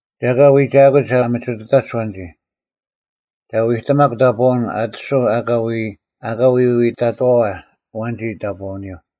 ᒐ ᐊᑲ ᐎᒐᐊᑯᒡ ᐊ ᒥᒋᑐᑕᒡ ᐊᐛᓐᒋ᙮ ᒐ ᐎᑎᒪᒄ ᑕᑈᐅᓐ ᐊᑎᓱᐧᒄ ᐊᑲ ᐎᐎᑕᑥᐛ ᐊᐛᓐᒋ ᑕᑈᐅᓂᔪᐤ᙮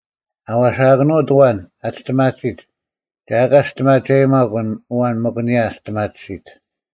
ᐊ ᐛᓴᑭᓄᐅᑦ ᐊᐛᓐ ᐊᒋ ᒋᔅᑎᒪᑎᓯᑦ, ᒐ ᐊᑲ ᒋᔅᑎᒪᒐᔨᒪᒄ ᐊᓐ ᐊᐛᓐ ᒥᒄ ᐊᓂᔭ ᐊ ᒋᔅᑎᒪᑎᓯᑦ᙮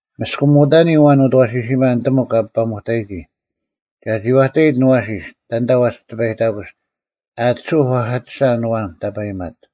ᒥᔅᑭᒧᑕᓂ ᐊᐛᓐ ᐅᑦ ᐊᐛᓯᓯᒪ ᓂᑎᒥᒄ ᐊᐱᐸᒥᐸᑕᔨᒋ, ᒐ ᒋᐛᑕᐃᑦ ᐊᓐ ᐊᐛᓯᔅ ᑕᓐᑕ ᐛᒋ ᑎᐸᐃᑕᑯᓯᑦ ᐊᑎᓱᐧᒄ ᐛᐧᑲᑎᔅᒐ ᐊᓐ ᐊᐛᓐ ᑕᐸᔨᒪᑦ᙮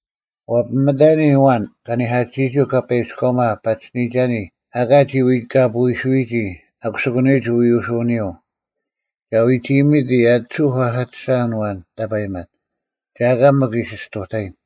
ᐛᐱᒥᑕᓂᔾ ᐊᐛᓐ ᑲᓂᐧᑲᑎᓯᔨᒋ ᐅᑲᐸᐃᑭᔎᒪ ᐸᒋᓯᓂᔨᒐᓂ ᐊᑲ ᒋ ᐎᑲᐳᐎᓱᐅᐎᔨᒋ ᐊᑯᓯᑯᓂᔨᒡ ᐎᐅᓱᐅᓂᔪᐤ᙮ ᒐ ᐎᒋᐃᒥᑎ ᐊᑎᓱᐧᒄ ᐛᐧᑲᑎᔅᒐ ᐊᓐ ᐊᐛᓐ ᑕᐸᔨᒪᑦ, ᒐ ᐊᑲ ᒥᒄ ᐃᓯ ᔅᑐᑕᔨᓐ᙮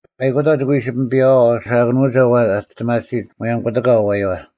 ᐸᐃᑯᑕᐤ ᒋᑭ ᐎ ᐃᓯ ᐱᒥᐱᔭᐛᐤ ᐛᓴᐊᑭᓄᒐ ᐊᐛᓐ ᐊ ᒋᔅᑎᒪᑎᓯᑦ ᒧᔭᒻ ᑯᑎᑲ ᐊᐛᔪᐛ᙮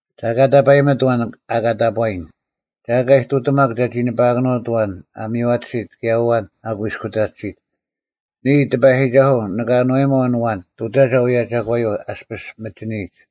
ᒐ ᐊᑲ ᑕᐸᔨᒥᑦ ᐊᐛᓐ ᐊᑲ ᑕᑈᔨᓐ, ᒐ ᐊᑲ ᐃᑐᑎᒪᒄ ᒐᒋ ᓂᐸᐊᑭᓄᐅᑦ ᐊᐛᓐ ᐊ ᒥᔽᑎᓯᑦ ᑭᔭ ᐊᐛᓐ ᐊ ᑯᐃᔅᑯᑕᑎᓯᑦ᙮ ᓂᔾ, ᑎᐸᔨᒋᒐᓱᐤ, ᓂᑭ ᐊᓏᔨᒪᐤ ᐊᓐ ᐊᐛᓐ ᑐᑕᒐ ᐅᔭ ᒐᒂᔪᐤ ᐊᔅᐱᔅ ᒥᒋᓂᔨᒡ᙮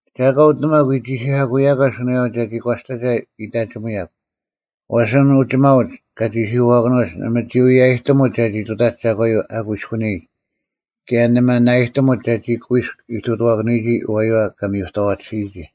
ᒐ ᐊᑲ ᐅᑎᓂᒪᒄ ᐎ ᒋᓯᐧᑲᑯᐅᔭᒂ ᓱᓇᔭᐤ ᒐᒋ ᒂᔅᑕᒐ ᐃᑕᒋᒧᔭᒄ, ᐛᔅ ᐊᓐᒡ ᐅᒋᒪᐅᒡ ᑲ ᒋᓯᐧᑯᐛᑭᓄᐅᒡ ᓇᒪ ᒋ ᐎᔭᔨᑎᒧᒡ ᒐᒋ ᑐᑕᒡ ᒐᒂᔪᐤ ᐊ ᑯᐃᔅᑯᓂᔨᒡ, ᑭᔭ ᓇᒪ ᓇᐊᔨᑎᒧᒡ ᒐᒋ ᑯᐃᔅᒄ ᐃᑐᑐᐛᑭᓄᐎᒋ ᐊᐛᔪᐛ ᑲ ᒥᔪᑥᐛᑎᓯᔨᒋ᙮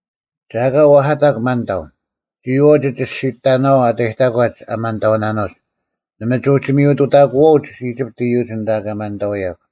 ᒐ ᐊᑲ ᐛᐧᑲᑕᒄ ᒪᓐᑕᐤ, ᒋᔨᐛᐤ ᒋ ᒋᔅᒋᑕᓇᐛᐤ ᐊ ᑕᔨᑕᒂᒡ ᐊ ᒪᓐᑕᐅᓇᓄᒡ, ᓇᒪ ᒋ ᐅᒋ ᒥᔪᑐᑕᑯᐛᐅᒡ ᐃᒋᑉᑦ ᐃᔪᒡ ᐊᓐᑕ ᑲ ᒪᓐᑕᐅᔭᒄ᙮”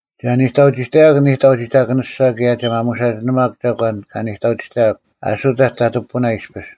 “ᒐ ᓂᑕᐅᒋᑕᔭᒄ ᓂᑕᒋᒋᑭᓂᔅᒐ ᑭᔭ ᒐ ᒪᒧᓴᒋᓂᒪᒄ ᒐᒂᓐ ᑲ ᓂᑕᐅᒋᑕᔭᒄ ᐊᓱᑕᒡ ᑕᑐᐤ ᐱᐳᓇ ᐃᔅᐱᔅ᙮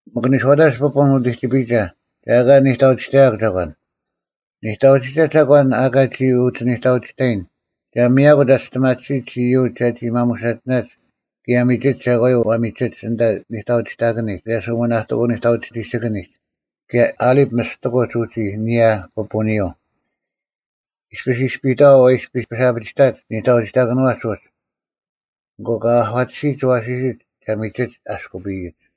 ᒥᒄ ᓂᔄᐅᑕᒡ ᐱᐳᓐ ᐅᑎᒋᐱᔨᒐ ᒐ ᐊᑲ ᓂᑕᐅᒋᑕᔭᒄ ᒐᒂᓐ᙮ ᓂᑕᐅᒋᒐ ᒐᒂᓐ ᐊ ᐊᑲ ᒋᔾ ᐅᒋ ᓂᑕᐅᒋᑕᔨᓐ, ᒐ ᒥᔭᑯᒡ ᐊ ᒋᔅᑎᒪᑎᓯᒡ ᐃᔪᒡ ᒐᒋ ᒪᒧᓴᒋᓇᒡ ᑭᔭ ᒥᒋᒡ ᒐᒂᔪᐤ ᐛᒥᒋᒡ ᐊᓐᑕ ᓇᑕᐅᒋᑕᑭᓂᒡ ᑭᔭ ᓱᒥᓇᑎᑯᐤ ᓂᑕᐅᒋᒋᑭᐊᓂᒡ ᑭᔭ ᐊᓕᑉ ᒥᔅᑎᑯᒡ ᐅᒋ ᐊᓂᔭ ᐱᐳᓂᔪᐤ᙮ ᐃᔅᐱ ᐃᔅᐱᔨᑥᐛ ᐛ ᐃᔅᐱᔅ ᐊᐱᒋᑕᒡ ᒋᓂᑕᐅᒋᑕᑭᓄᐛᒡ ᐅᒡ, ᐊᑯ ᑲ ᐊᒂᑎᓯᒡ ᐊᐛᓯᓯᒡ ᒐᒥᒋᒡ ᐊᔅᑯᐱᔨᒡ᙮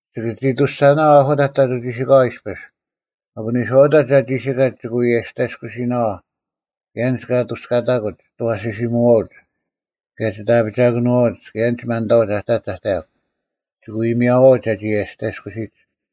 ᒋᑭ ᒋ ᐊᑐᔅᒐᓇᐛᐤ ᐊᓱᑕᒡ ᑕᑐᐤ ᒋᓯᑲᐛ ᐃᔅᐱᔅ, ᒥᒄ ᓂᔄᐅᑕᒡ ᐊᒋᓯᑲᒡ ᒋᑭ ᐎ ᐊᔅᑕᔭᔅᑯᓯᓇᐛᐤ ᑭᔭ ᐊᓐᒡ ᑲᑐᔅᑲᐊᑯᒡ ᒋᑦ ᐊᐛᓯᓯᒧᐛᐅᒡ, ᑭᔭ ᒋᑦ ᐊᐱᒐᑭᓄᐛᐅᒡ ᑭᔭ ᐊᓐᒡ ᐊ ᒪᓐᑕᐅᒡ ᐊᑕᒡ ᐊᑕᔭᒄ᙮ ᒋᑭ ᐎ ᒥᔭᐛᐅᒡ ᒐᒋ ᐊᔅᑕᔭᔅᑯᓯᒡ᙮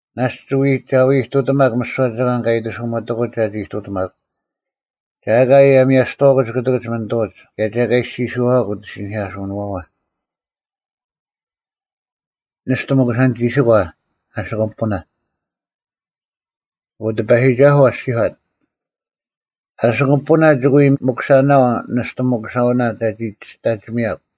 ᓇᔅᒡ ᒐ ᐎ ᐃᑐᑎᒪᒄ ᒥᓯᐛ ᒐᒂᓐ ᑲ ᐃᑎᓱᒥᑎᑯᒡ ᒐᒋ ᐃᑐᑎᒪᒄ᙮ ᒐ ᐊᑲ ᐊᔭᒥᐊᔅᑐᐛᑯᒡ ᑯᑎᑭᒡ ᒪᓂᑐᐅᒡ, ᑭᔭ ᒐ ᐊᑲ ᐃᔅᒋᔄᐛᒄ ᐅᑦ ᐃᓯᓂᐧᑲᓱᓂᐛᐛ᙮” ᓂᔅᑐ ᒥᑯᓴᓐ-ᒋᓯᒂ ᐊᓯᑯᒻ ᐱᐳᓇ᙮ ᐊᑯ ᑎᐸᔨᒋᒐᓱᐤ ᐊᔅᒋᔄᑦ: “ᐊᓯᑯᒻ ᐱᐳᓇ ᒋᑭ ᐎ ᒥᑯᓴᓇᐛᐤ ᓂᔅᑐ ᒥᑯᓴᐅᓇ ᒐᒋ ᒋᔅᑕᔨᒥᔭᒄ᙮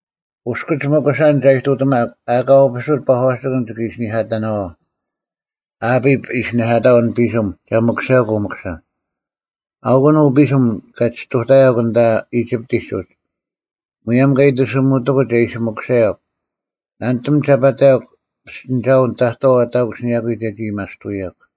ᐅᔅᑭᒡ ᒥᑯᓴᓐ ᒐ ᐃᑐᑎᒪᒄ ᐊᑲ ᐅᐱᓱᑦ ᐸᒂᓯᑭᓐ ᒋᑭ ᐃᓯᓂᐧᑲᑕᓇᐛᐤ᙮ ᐊᐱᑉ ᐃᓯᓂᐧᑲᑕᐤ ᐊᓐ ᐱᓯᒻ ᒐ ᒥᑯᓴᔭᒄ ᐅ ᒥᑯᓴᓐ᙮ ᐊᐅᑯᓐ ᐅ ᐱᓯᒻ ᑲ ᒋᔅᑐᑕᔭᒄ ᐊᓐᑕ ᐃᒋᑉᑎᒡ ᐅᒡ᙮ ᒧᔭᒻ ᑲ ᐃᑎᓱᒥᑎᑯᒡ ᒐ ᐃᓯ ᒥᑯᓴᔭᒄ᙮ ᓇᓂᑎᒻ ᒐ ᐸᑕᔭᒄ ᐱᔅᑎᓂᒐᐅᓐ ᑕᑥᐤ ᑕᑯᓯᓂᔭᑯᐤ ᒐᒋ ᐊᔭᒥᐊᔅᑐᐅᔭᒄ᙮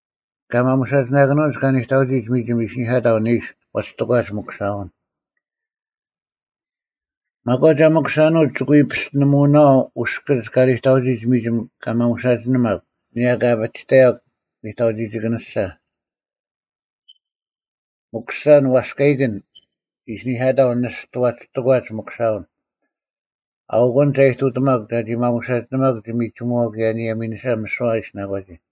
ᑲ ᒪᒧᓴᒋᓂᑭᓄᐅᒡ ᑲ ᓂᑕᐅᒋᒡ ᒥᒋᒻ ᐃᓯᓂᐧᑲᑕᐤ ᓂᓱ ᐛᒋ ᑎᒂᒡ ᒪᑯᓴᐅᓐ᙮ ᒪᒂᒡ ᐊ ᒥᑯᓴᓄᐅᒡ ᒋᑭ ᐎ ᐱᔅᑎᓂᒧᐅᓇᐛᐤ ᐅᔅᑭᒡ ᑲ ᓂᑕᐅᒋᒡ ᒥᒋᒻ ᑲ ᒪᒧᓴᒋᓂᒪᒄ ᐊᓂᔭ ᑲ ᐊᐱᒋᑕᔭᒄ ᓂᑕᐅᒋᒋᑭᓂᔅᒐ᙮ ‘ᒥᑯᓴᓐ ᐛᔅᑲᐃᑭᓇ’ ᐃᓯᓂᐧᑲᑕᐤ ᓂᔅᑐ ᐛᒋ ᑎᒂᒡ ᒪᑯᓴᐅᓐ᙮ ᐊᐅᑯᓐ ᒐ ᐃᑐᑎᒪᒄ ᒋ ᒪᒧᓴᒋᓂᒪᒄ ᒋ ᒥᒋᒧᐛᐤ ᑭᔭ ᐊᓂᔭ ᒥᓂᓴ ᒥᓯᐛ ᐊ ᐃᓯᓇᒂᒋ᙮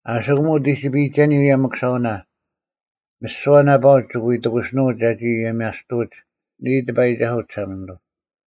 ᐊᓯᑯᒻ ᐅᑎᒋᐱᔨᒐᓂ ᐅᔭ ᒥᑯᓴᐅᓇ, ᒥᓯᐛ ᓇᐸᐅᒡ ᒋᑭ ᐎ ᑎᑯᓯᓄᐅᒡ ᒐᒋ ᐊᔭᒥᐊᔅᑐᐅᒡ, ᓂᔾ ᑎᐸᔨᒋᒐᓱᐤ ᒋᓴᒪᓂᑐᐤ᙮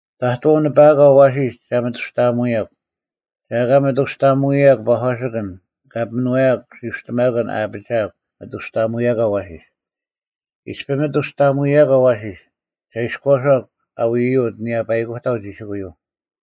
ᑕᑥᐤ ᓂᐸᐊᒂ ᐊᐛᓯᔅ ᒐ ᒥᑐᔅᑕᐊᒧᐅᔭᒄ, ᒐ ᐊᑲ ᒥᑐᔅᑕᐊᒪᒐᔭᒄ ᐸᒂᓯᑭᓐ ᑲ ᐱᒥᓄᐛᔭᒄ ᓯᐅᔅᑎᒪᑭᓐ ᐊ ᐊᐱᒋᐊᒄ ᒪᑐᔅᑕᐊᒧᔭᐅᑯ ᐊᐛᓯᔅ᙮ ᐃᔅᐱ ᒥᑐᔅᑕᐊᒧᔭᒂ ᐊᐛᓯᔅ, ᒐ ᐃᔎᔄᒄ ᐊ ᐎᔪᐅᑦ ᐊᓂᔭ ᐸᐃᑯᑕᐤ ᒋᓯᑯᔪᐤ᙮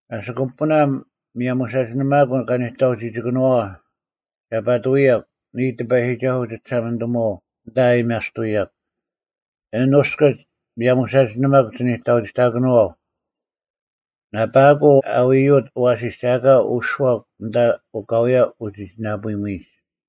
ᐊᓯᑯᒻ ᐱᐳᓇ, ᒥᔭᒧᓴᒋᓂᒪᑯᐤ ᒋᓂᑕᐅᒋᑕᑭᓄᐛᐛ, ᒐ ᐸᑐᐅᔭᒄ, ᓂᔾ ᑎᐸᔨᒋᒐᓱᐤ ᒋᒋᓴᒪᓂᑐᒧᐛᐤ, ᐊᓐᑕ ᐊᔭᒥᐊᔅᑐᐅᔭᒄ, ᐊᓐ ᐅᔅᑭᒡ ᒥᔭᒧᓴᒋᓂᒪᒄ ᒋᓂᑕᐅᒋᑕᑭᓄᐛᐤ᙮ ᓇᐸᐊᑯᐤ ᐊ ᐊᐛᓯᐅᑦ ᐊᐛᓯᔅ ᒐ ᐊᑲ ᐅᔄᒄ ᐊᓐᑕ ᐅᑲᐎᔭ ᐅᒋᒋᓇᐳᐃᒥᔨᒡ᙮”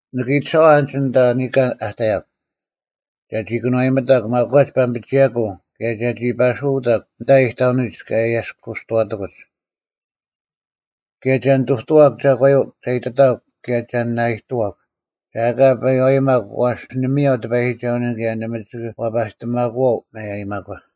“ᓂᑭ ᐃᑎᓴᐛᐤ ᐊᓐᒋᓐ ᐊᓐᑕ ᓂᑲᓐ ᐊ ᑕᔭᒄ, ᒐᒋ ᓇᑭᑐᐛᔨᒥᑕᒄ ᒪᒂᒡ ᐸᒥᐱᒋᐊᑯᐤ ᑭᔭ ᒐᒋ ᐸᓱᐅᑕᒄ ᐊᓐᑕ ᐃᑕᐅᓂᒡ ᑲ ᐊᔭᔅᑯᔅᑐᐛᑎᑯᒡ᙮ ᑭᔭ ᒐ ᓂᑐᑐᐛᒄ ᒐᒂᔪᐤ ᒐ ᐃᑎᑕᒃ ᑭᔭ ᒐ ᓇᐃᑐᐛᒄ᙮ ᒐ ᐊᑲ ᐱᐛᔨᒪᒄ ᐛᔅ ᓂ ᒥᔭᐤ ᑎᐸᔨᒋᒐᐅᓂᔪᐤ ᑭᔭ ᓇᒪ ᒋᑭ ᐛᐸᔨᑎᒪᑯᐛᐤ ᒪᔭᔨᒪᒂ᙮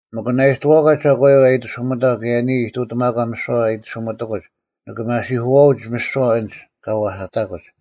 ᒥᒄ ᓇᐃᑐᐛᒂ ᒐᒂᔪᐤ ᐊ ᐃᑎᓱᒥᑕᒄ ᑭᔭ ᓂᔾ ᐃᑐᑎᒪᒂ ᒥᓯᐛ ᐊᐃᑎᓱᒥᑎᑯᒡ ᓂᑭ ᒪᓯᐧᑯᐛᐅᒡ ᒥᓯᐛ ᐊᓐᒡ ᑲ ᐛᐧᑲᑎᑕᑯᒡ᙮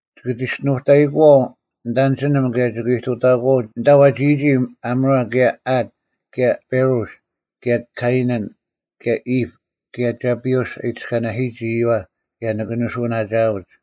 ᒋᑭ ᒋᔅᒋᓄᑕᔨᑯᐛᐤ ᓂᑦ ᐊᓐᒋᓂᒻ ᑭᔭ ᒋᑭ ᐃᑐᑕᐃᑯᐛᐤ ᐊᓐᑕ ᐛᒋᔨᒋ ᐊᒧᕆ ᑭᔭ ᐊᑦ ᑭᔭ ᐸᕆᔅ ᑭᔭ ᑲᐃᓇᓐ ᑭᔭ ᐃᑉ ᑭᔭ ᒐᐱᐅᔅ ᐊ ᐃᑎᔅᑲᓇᓯᔨᒋ ᐃᔪᐛ ᑭᔭ ᓂᑭ ᓂᓱᐅᓇᒋᐊᐅᒡ᙮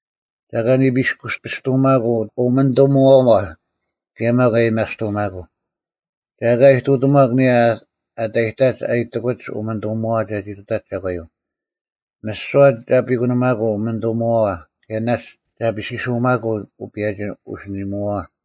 ᒐ ᐊᑲ ᓂᐱᔅᑯᐱᔅᑐᒪᑯᐤ ᐅᒪᓂᑐᒧᐛᐛ, ᑭᔭ ᒪᒃ ᐊᔭᒥᐊᔅᑐᒪᑯᐤ᙮ ᒐ ᐊᑲ ᐃᑐᑎᒺᒄ ᐊᓂᔭ ᐊᑕᔨᑕᒡ ᐊ ᐃᑎᑯᒡ ᐅᒥᓂᑐᒧᐛᐛ ᒐᒋ ᑐᑕᒡ ᒐᒂᔪᐤ᙮ ᒥᓯᐛ ᒐ ᐱᑯᓇᒪᑯᐤ ᐅᒪᓂᑐᒧᐛᐛ ᑭᔭ ᓇᔅᒡ ᒐᐱᓴᓱᒪᑯᐤ ᐅᐸᔭᒋ ᐅᓯᓂᒧᐛᐛ᙮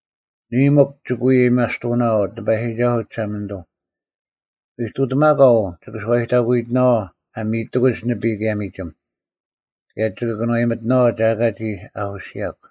ᓂᔾ, ᒥᒄ ᒋᑭ ᐎ ᐊᔭᒥᐊᔅᑐᐅᓇᐛᐤ, ᑎᐸᔨᒋᒐᓱᐤ ᒋᓴᒪᓂᑐᐤ, ᐃᑐᑎᒪᒂ ᐅ ᒋᑭ ᓱᐛᔨᑕᑯᐃᑎᓇᐛᐤ ᐊ ᒥᔨᑎᑯᒡ ᓂᐱᔾ ᑭᔭ ᒥᒋᒻ, ᑭᔭ ᒋᑭ ᑭᓄᐛᔨᒥᑎᓇᐛᐤ ᒐ ᐊᑲ ᒋ ᐊᐧᑯᓯᔭᒄ᙮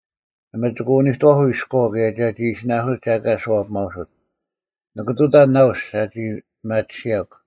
ᓇᒪ ᒋᑭ ᐅᓂᑕᓱᐤ ᐃᔎᐤ ᑭᔭ ᒐᒋ ᐃᓯᓇᑯᓯᑦ ᒐ ᐊᑲ ᒋ ᓱᐛᐱᒪᐅᓱᑦ᙮ ᓂᑭ ᑐᑕᓐ ᓇᐅᔅ ᒐᒋ ᐱᒪᑎᓯᔭᒄ᙮”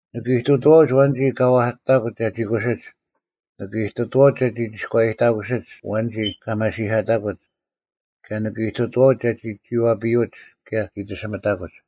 ᓂᑭ ᐃᑐᑐᐛᐅᒡ ᐊᐛᓐᒋ ᑲ ᐛᐧᑲᑎᑕᑯᒡ ᒐᒋ ᑯᓯᒡ᙮ ᓂᑭ ᐃᑐᑐᐛᐅᒡ ᒐᒋ ᒋᔎᔭᑕᑯᓯᒡ ᐊᐛᓐᒋ ᐊ ᒪᓯᐧᑲᑕᑯᒡ᙮ ᑭᔭ ᓂᑭ ᐃᑐᑐᐛᐅᒡ ᒐᒋ ᒋᐛᐱᔪᐅᒡ ᑭᔭ ᒋᑎᓯᒥᑕᑯᒡ᙮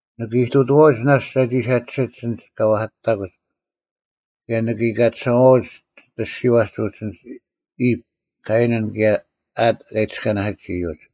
ᓂᑭ ᐃᑐᑐᐛᐅᒡ ᓇᔅᒡ ᒐᒋ ᓴᒋᓯᒡ ᐊᓐᒡ ᑲ ᐛᐧᑲᑎᑕᑯᒡ᙮ ᑭᔭ ᓂᑭ ᐃᑲᑎᓴᐛᐅᒡ ᒋᑦ ᐊᔅᒋᐛᒡ ᐅᒡ ᐊᓐᒡ ᐃᑉ, ᑲᐃᓇᓐ, ᑭᔭ ᐊᑦ ᑲ ᐃᑎᔅᑲᓇᓯᒡ ᐃᔪᒡ᙮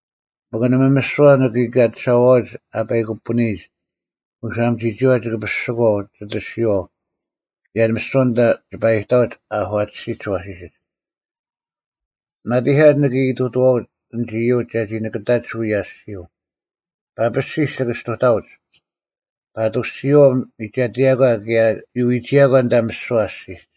ᒥᒄ ᓇᒪ ᒥᓯᐛ ᓂᑭ ᐃᑲᑎᓴᐛᐅᒡ ᐊ ᐸᐃᑯᐳᓂᐃᒡ ᐅᓴᒻ ᒋᒋᐛ ᒋᐸ ᐱᓯᒂᐤ ᒋᑦ ᐊᔅᒋᐛᐤ ᑭᔭ ᒥᓯᐛ ᐊᓐᑕ ᒋᐸ ᐃᑕᐅᒡ ᐊᒂᑎᓯᒡ ᐊᐛᓯᓯᒡ᙮ ᒪᑎᐧᑲᒡ ᓂᑭ ᐃᑐᑐᐛᐅᒡ ᐊᓐᒡ ᐃᔪᒡ ᒐᒋ ᓂᑭᑕᒡ ᐅᔭ ᐊᔅᒋᔪᐤ, ᐸᐱᓯᔅ ᒋᑭ ᒋᔅᑐᑕᐅᒡ, ᐸᑐᔅ ᒋᔨᐛᐤ ᒥᒐᑎᔭᒂ ᑭᔭ ᒋ ᐎᒋᔭᒂ ᐊᓐᑕ ᒥᓯᐛ ᐊᔅᒋᒡ᙮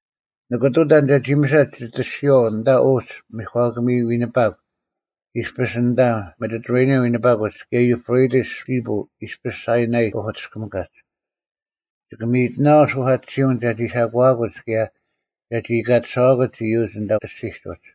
ᓂᑭ ᑐᑕᓐ ᒐᒋ ᒥᓴᒡ ᒋᑦ ᐊᔅᒋᐛᐤ ᐊᓐᑕ ᐅᒡ ᒥᒂᑭᒥ ᐎᓂᐸᒄ ᐃᔅᐱᔅ ᐊᓐᑕ ᒥᑎᑐᕋᓂᔭᓐ ᐎᓂᐸᑯᒡ ᑭᔭ ᔪᑉᕆᑎᔅ ᓯᐱᔾ ᐃᔅᐱᔅ ᓴᐃᓇᐃ ᐸᐧᑯᔅᑎᔅᑭᒥᑲᒡ᙮ ᒋᑭ ᒥᔨᑎᓇᐛᐤ ᓱᐧᑲᑎᓯᐅᓐ ᒐᒋ ᓴᒂᐊᑯᒡ ᑭᔭ ᒐᒋ ᐃᑲᑎᓴᐛᑯᒡ ᐃᔪᒡ ᐊᓐᑕ ᐊᔅᒋᒡ ᐅᒡ᙮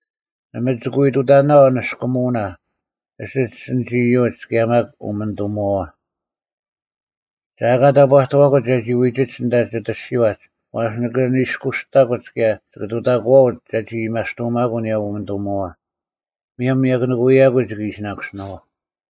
ᓇᒪ ᒋᑭ ᐎ ᑐᑕᓇᐛᐤ ᓂᔅᑯᒧᐅᓇ ᐊᓯᒡ ᐊᓐᒡ ᐃᔪᒡ ᑭᔭ ᒪᒃ ᐅᒪᓂᑐᒧᐛᐛ᙮ ᒐ ᐊᑲ ᑕᑈᑐᐛᑯᒡ ᒐᒋ ᐎᒋᒡ ᐊᓐᑕ ᒋᑦ ᐊᔅᒋᐛᒡ ᐛᔅ ᓂᑭ ᓂᔅᑯᔅᑕᑯᒡ ᑭᔭ ᒋᑭ ᑐᑕᑯᐛᐅᒡ ᒐᒋ ᐊᔭᒥᐊᔅᑐᒪᑯᐤ ᐊᓂᔭ ᐅᒪᓂᑐᒧᐛᐛ, ᒧᔭᒻ ᒥᔭᑯᓂᑯᔭᑯᐤ ᒋᑭ ᐃᓯᓇᑯᓯᓇᐛᐤ᙮